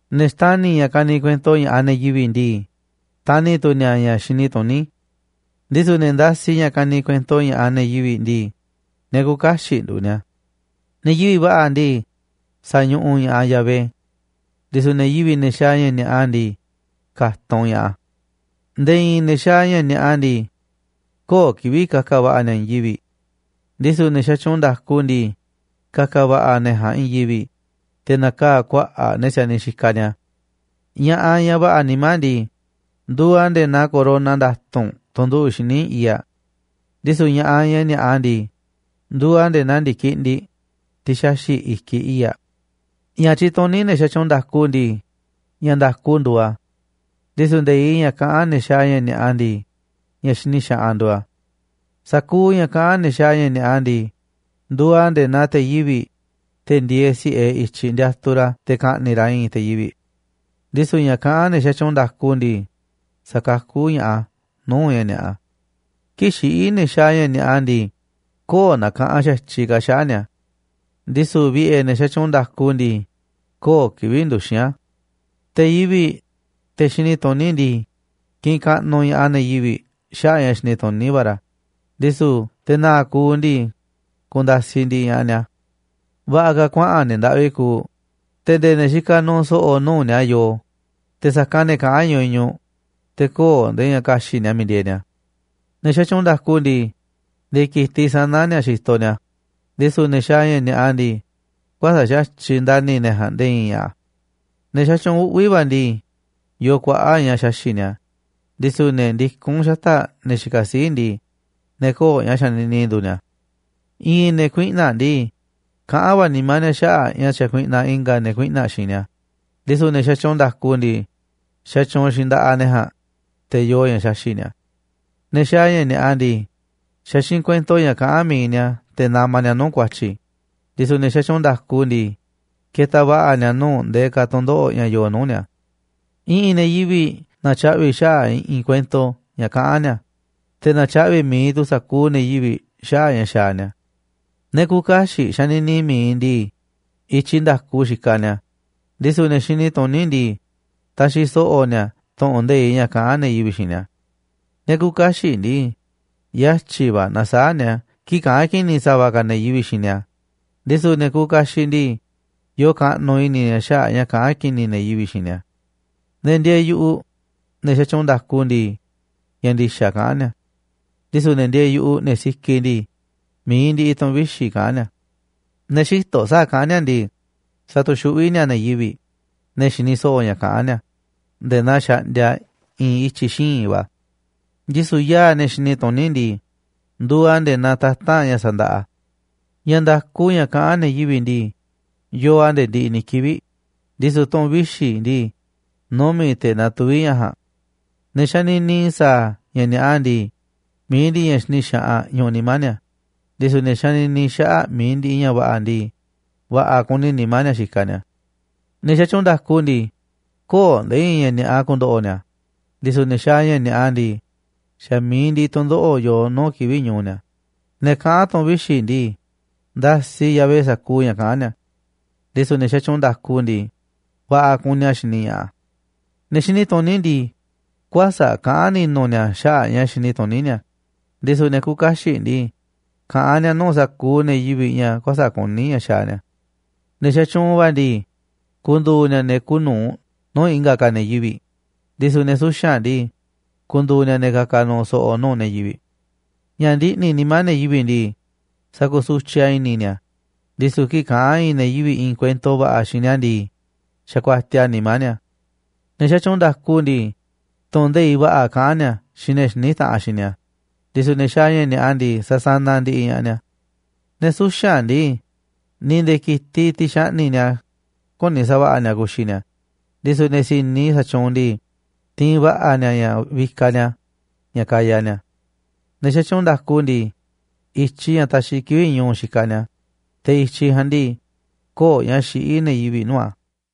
Ne̱ xtani̱ ña̱ kani kuento ña̱ꞌaꞌ ne̱ yivi̱ꞌ ndii, xtani̱ tu̱ ni̱a̱ ña̱ xini tuní, ndisu̱ ne̱ ndasiꞌ ña̱ kani kuento ña̱ꞌaꞌ ne̱ yivi̱ꞌ ndii, ne̱ küuꞌ kaxiꞌ nduuꞌ ni̱a̱. Ne̱ yivi̱ꞌ va̱ꞌa̱ ndii, sañuꞌuꞌ ña̱ꞌaꞌ Yahvé, ndisu̱ ne̱ yivi̱ꞌ, ne̱ xaaꞌ ña̱ ni̱a̱ꞌa ndii, ka̱tunꞌ ña̱ꞌaꞌ a̱. Nde̱e̱ i̱i̱n ne̱ xaaꞌ ña̱ ni̱a̱ꞌa ndii, köo̱ꞌ kivi̱ꞌ ka̱ka̱ va̱ꞌa̱ ni̱a̱ i̱i̱n yivi̱ꞌ, ndisu̱ ne̱ xatyuunꞌ nda̱ku ndii, ka̱ka̱ va̱ꞌa̱ ne̱ ja̱a̱nꞌ i̱i̱n yivi̱ꞌ, te̱ na̱kaa̱ kuaꞌa̱ꞌ ne̱ si̱a̱niꞌ xikaꞌ ni̱a̱. Ña̱ꞌaꞌ, ñaꞌ va̱ꞌa̱ nimá ndii, nduuꞌ aꞌ nde̱e̱ naa corona nda̱tu̱nꞌ tunꞌ nduꞌu̱ꞌ xíniꞌ i̱i̱ꞌ aꞌ, ndisu̱ ña̱ꞌaꞌ, ña̱ ni̱a̱ꞌa ndii, nduuꞌ aꞌ nde̱e̱ naa ndi̱kindiꞌ, tiꞌ xaxi̱ꞌ i̱kiꞌ i̱i̱ꞌ aꞌ. Ña̱ tyituní ne̱ xatyuunꞌ nda̱ku ndii, ña̱ nda̱ku nduuꞌ a̱, ndisu̱ nde̱iꞌ ña̱ kaꞌán ne̱ xaaꞌ ña̱ ni̱a̱ꞌa ndii, ña̱ xini xaꞌanꞌ nduuꞌ a̱. Sa̱kuuꞌ ña̱ kaꞌán ne̱ xaaꞌ ña̱ ni̱a̱ꞌa ndii, nduuꞌ a̱ nde̱e̱ naa te̱ yivi̱ꞌ, te̱ ndieeꞌ si̱ꞌe i̱tyiꞌ ndiatuꞌ ra̱ te̱ ka̱ꞌni̱ꞌ ra̱ i̱i̱n te̱ yivi̱ꞌ, ndisu̱ ña̱ kaꞌán ne̱ xatyuunꞌ nda̱ku ndii, sa̱kakú ña̱ꞌaꞌ a̱ nuu̱ꞌ ña̱ ni̱a̱ꞌa. Kii̱ꞌ xiꞌí ne̱ xaaꞌ ña̱ ni̱a̱ꞌa ndii, köo̱ꞌ nakaꞌanꞌ xa̱tyiꞌ ka̱ xaꞌa̱ꞌ ni̱a̱, ndisu̱ vi̱ꞌe̱ ne̱ xatyuunꞌ nda̱ku ndii, köo̱ꞌ kivi̱ꞌ nduxi̱n a̱. Te̱ yivi̱ꞌ, te̱ xini tuní ndii, kiꞌinꞌ kaꞌnuꞌ ña̱ꞌaꞌ ne̱ yivi̱ꞌ xaꞌa̱ꞌ a̱ ña̱ xini tuní va̱ ra̱, ndisu̱ te̱ na̱a̱ꞌ kuuꞌ ndii, ku̱nda̱siꞌ ndiꞌiꞌ ña̱ꞌaꞌ ni̱a̱. Va̱ꞌa̱ ka̱ kuaꞌa̱n ne̱ ndaꞌvi kuuꞌ, te̱ nde̱e̱ ne̱ xikaꞌ nu̱u̱ so̱ꞌo̱ nuu̱ꞌ ni̱a̱ yoo, te̱ sa̱kanꞌ ne̱ kaꞌán ñuñuꞌ, te̱ köo̱ꞌ nde̱e̱ ña̱ ka̱xi̱ꞌ ni̱a̱ miiꞌ ndieeꞌ ni̱a̱. Ne̱ xatyuunꞌ nda̱ku ndii, nde̱e̱ ki̱tiꞌ sa̱na̱ ni̱a̱ xitoꞌ ni̱a̱, ndisu̱ ne̱ xaaꞌ ña̱ ni̱a̱ꞌa ndii, kuäsa̱ꞌ xa̱tyiꞌ ndani̱ ne̱ ja̱a̱nꞌ nde̱e̱ i̱i̱n ña̱ꞌa̱. Ne̱ xatyuunꞌ uꞌvi̱ va̱ ndii, yoo kuaꞌa̱ꞌ ña̱ xaxi̱ꞌ ni̱a̱, ndisu̱ ne̱ ndikún xata̱ꞌ ne̱ xikaꞌ sii̱ꞌ ndii, ne̱ köo̱ꞌ ña̱ xanini nduuꞌ ni̱a̱. I̱ꞌi̱n ne̱ kuiꞌna̱ꞌ ndii, kaꞌán va̱ nimá ni̱a̱ xaꞌa̱ꞌ ña̱ xakuiꞌnaꞌ i̱nga̱ ne̱ kuiꞌna̱ꞌ xiinꞌ ni̱a̱, ndisu̱ ne̱ xatyuunꞌ nda̱ku ndii, xatyuunꞌ xiinꞌ nda̱ꞌaꞌ ne̱ ja̱a̱nꞌ, te̱ yoo ña̱ xaxi̱ꞌ ni̱a̱. Ne̱ xaaꞌ ña̱ ni̱a̱ꞌa ndii, xa̱ xiinꞌ kuento ña̱ kaꞌán mi̱iꞌ ni̱a̱ te̱ namaꞌ ni̱a̱ nuu̱ꞌ ku̱a̱tyi̱, ndisu̱ ne̱ xatyuunꞌ nda̱ku ndii, ketaꞌ va̱ꞌa̱ ni̱a̱ nuu̱ꞌ ndee ka̱ tu̱ndoꞌo̱ꞌ ña̱ yoo nuu̱ꞌ ni̱a̱. I̱ꞌi̱n ne̱ yivi̱ꞌ na̱tyaꞌvi̱ xaꞌa̱ꞌ i̱ꞌi̱n kuento ña̱ kaꞌán ni̱a̱, te̱ natyaꞌvi̱ mi̱iꞌ tu̱ sa̱kuuꞌ ne̱ yivi̱ꞌ xaꞌa̱ꞌ ña̱ xaaꞌ ni̱a̱. Ne̱ küuꞌ kaxiꞌ xanini mi̱iꞌ ndii, i̱tyiꞌ nda̱ku xikaꞌ ni̱a̱, ndisu̱ ne̱ xini tuní ndii, taxiꞌ so̱ꞌo̱ ni̱a̱ tu̱ꞌu̱n nde̱iꞌ ña̱ kaꞌán ne̱ yivi̱ꞌ xiinꞌ ni̱a̱. Ne̱ küuꞌ kaxiꞌ ndii, yatyi̱ va̱ nasaáꞌ ni̱a̱ kii̱ꞌ kaꞌán ki̱ni̱ ne̱ yivi̱ꞌ xiinꞌ ni̱a̱, ndisu̱ ne̱ kuuꞌ kaxiꞌ ndii, yoo kaꞌnuꞌ i̱ni̱ ni̱a̱ xaꞌa̱ꞌ ña̱ kaꞌán ki̱ni̱ ne̱ yivi̱ꞌ xiinꞌ ni̱a̱. Ne̱ ndieeꞌ yu̱ꞌuꞌ, ne̱ xatyuunꞌ nda̱ku ndii, ña̱ ndi̱xa̱ kaꞌán ni̱a̱, ndisu̱ ne̱ ndieeꞌ yu̱ꞌuꞌ, ne̱ sikiꞌ ndii, mi̱iꞌ ndiꞌiꞌ tu̱ꞌu̱n vixi̱ kaꞌán ni̱a̱. Ne̱ xïtoꞌ sa̱a̱ kaꞌán ni̱a̱ ndii, satuxuꞌví ni̱a̱ ne̱ yivi̱ꞌ, ne̱ xini so̱ꞌo̱ ña̱ kaꞌán ni̱a̱, nde̱e̱ naa xaꞌndia i̱i̱n ityi̱ xíinꞌ va̱, ndisu̱ yaa̱ꞌ ne̱ xini tuní ndii, nduuꞌ a̱ nde̱e̱ naa tata̱nꞌ ña̱ sandaꞌa. Ña̱ nda̱ku ña̱ kaꞌán ne̱ yivi̱ꞌ ndii, yoo a̱ nde̱e̱ ndiꞌiꞌ ni̱ kivi̱ꞌ, ndisu̱ tu̱ꞌu̱n vixi̱ ndii, numi̱ꞌ te̱ natuví ña̱ ja̱a̱nꞌ. Ne̱ xanini sa̱a̱ ña̱ ni̱a̱ꞌa ndii, mi̱iꞌ ndiꞌiꞌ ña̱ xini xaꞌanꞌ ñuꞌuꞌ nimá ni̱a̱, ndisu̱ ne̱ xanini xaꞌa̱ꞌ mi̱iꞌ ndiꞌiꞌ ña̱ va̱ꞌa̱ ndii, va̱ꞌa̱ kuni nimá ni̱a̱ xikaꞌ ni̱a̱. Ne̱ xatyuunꞌ nda̱ku ndii, köo̱ꞌ nde̱e̱ i̱i̱n ña̱ ni̱a̱ꞌa ku̱ndo̱ꞌo̱ ni̱a̱, ndisu̱ ne̱ xaaꞌ ña̱ ni̱a̱ꞌa ndii, xa̱ mi̱iꞌ ndiꞌiꞌ tu̱ndoꞌo̱ꞌ yoo nuu̱ꞌ kivi̱ꞌ ñu̱u̱ ni̱a̱. Ne̱ kaꞌán tu̱ꞌu̱n vixi̱ ndii, ndasiꞌ Yahvé sa̱kuuꞌ ña̱ kaꞌán ni̱a̱, ndisu̱ ne̱ xatyuunꞌ nda̱ku ndii, va̱ꞌa̱ kuni a̱ xini ña̱ꞌaꞌ a̱. Ne̱ xini tuní ndii, kuäsa̱ꞌ kaꞌán ni̱nu̱ ni̱a̱ xaꞌa̱ꞌ a̱ ña̱ xini tuní ni̱a̱, ndisu̱ ne̱ küuꞌ kaxiꞌ ndii, kaꞌán ni̱a̱ nuu̱ꞌ sa̱kuuꞌ ne̱ yivi̱ꞌ ña̱ kuäsa̱ꞌ kuní ña̱ xaaꞌ ni̱a̱. Ne̱ xatyuunꞌ va̱ ndii, ku̱ndu̱u̱ ni̱a̱ ne̱ kuuꞌ nu̱uꞌ nuu̱ꞌ i̱nga̱ ka̱ ne̱ yivi̱ꞌ, ndisu̱ ne̱ suxa̱nꞌ ndii, ku̱ndu̱u̱ ni̱a̱ ne̱ ka̱ka̱ nu̱u̱ so̱ꞌo̱ nuu̱ꞌ ne̱ yivi̱ꞌ. Ña̱ ndiꞌni̱ nimá ne̱ yivi̱ꞌ ndii, sa̱kusutyiꞌ a̱ i̱ni̱ ni̱a̱, ndisu̱ kii̱ꞌ kaꞌán i̱i̱n ne̱ yivi̱ꞌ i̱i̱n kuento va̱ꞌa̱ xiinꞌ ni̱a̱ ndii, xakuatiaꞌ a̱ nimá ni̱a̱. Ne̱ xatyuunꞌ nda̱ku ndii, tu̱ꞌu̱n nde̱iꞌ va̱ꞌa̱ kaꞌán ni̱a̱ xiinꞌ ne̱ xiní taꞌanꞌ xiinꞌ ni̱a̱, ndisu̱ ne̱ xaaꞌ ña̱ ni̱a̱ꞌa ndii, sasanaꞌ ndiꞌiꞌ ña̱ꞌaꞌ ni̱a̱. Ne̱ suxa̱nꞌ ndii, ni̱ nde̱e̱ ki̱tiꞌ, tiꞌ xaꞌni̱ꞌ ni̱a̱, küni sa̱va̱ꞌa̱ ni̱a̱ ku̱xi̱ ni̱a̱, ndisu̱ ne̱ si̱ni sa̱tyuunꞌ ndii, tiinꞌ va̱ꞌa̱ ni̱a̱ ña̱ vikaꞌ ni̱a̱ ña̱ kaya ni̱a̱. Ne̱ xatyuunꞌ nda̱ku ndii, i̱tyiꞌ ña̱ taxiꞌ kivi̱ꞌ ñu̱u̱ xikaꞌ ni̱a̱, te̱ i̱tyiꞌ ja̱a̱nꞌ ndii, köo̱ꞌ ña̱ xiꞌí ne̱ yivi̱ꞌ nuu̱ꞌ a̱.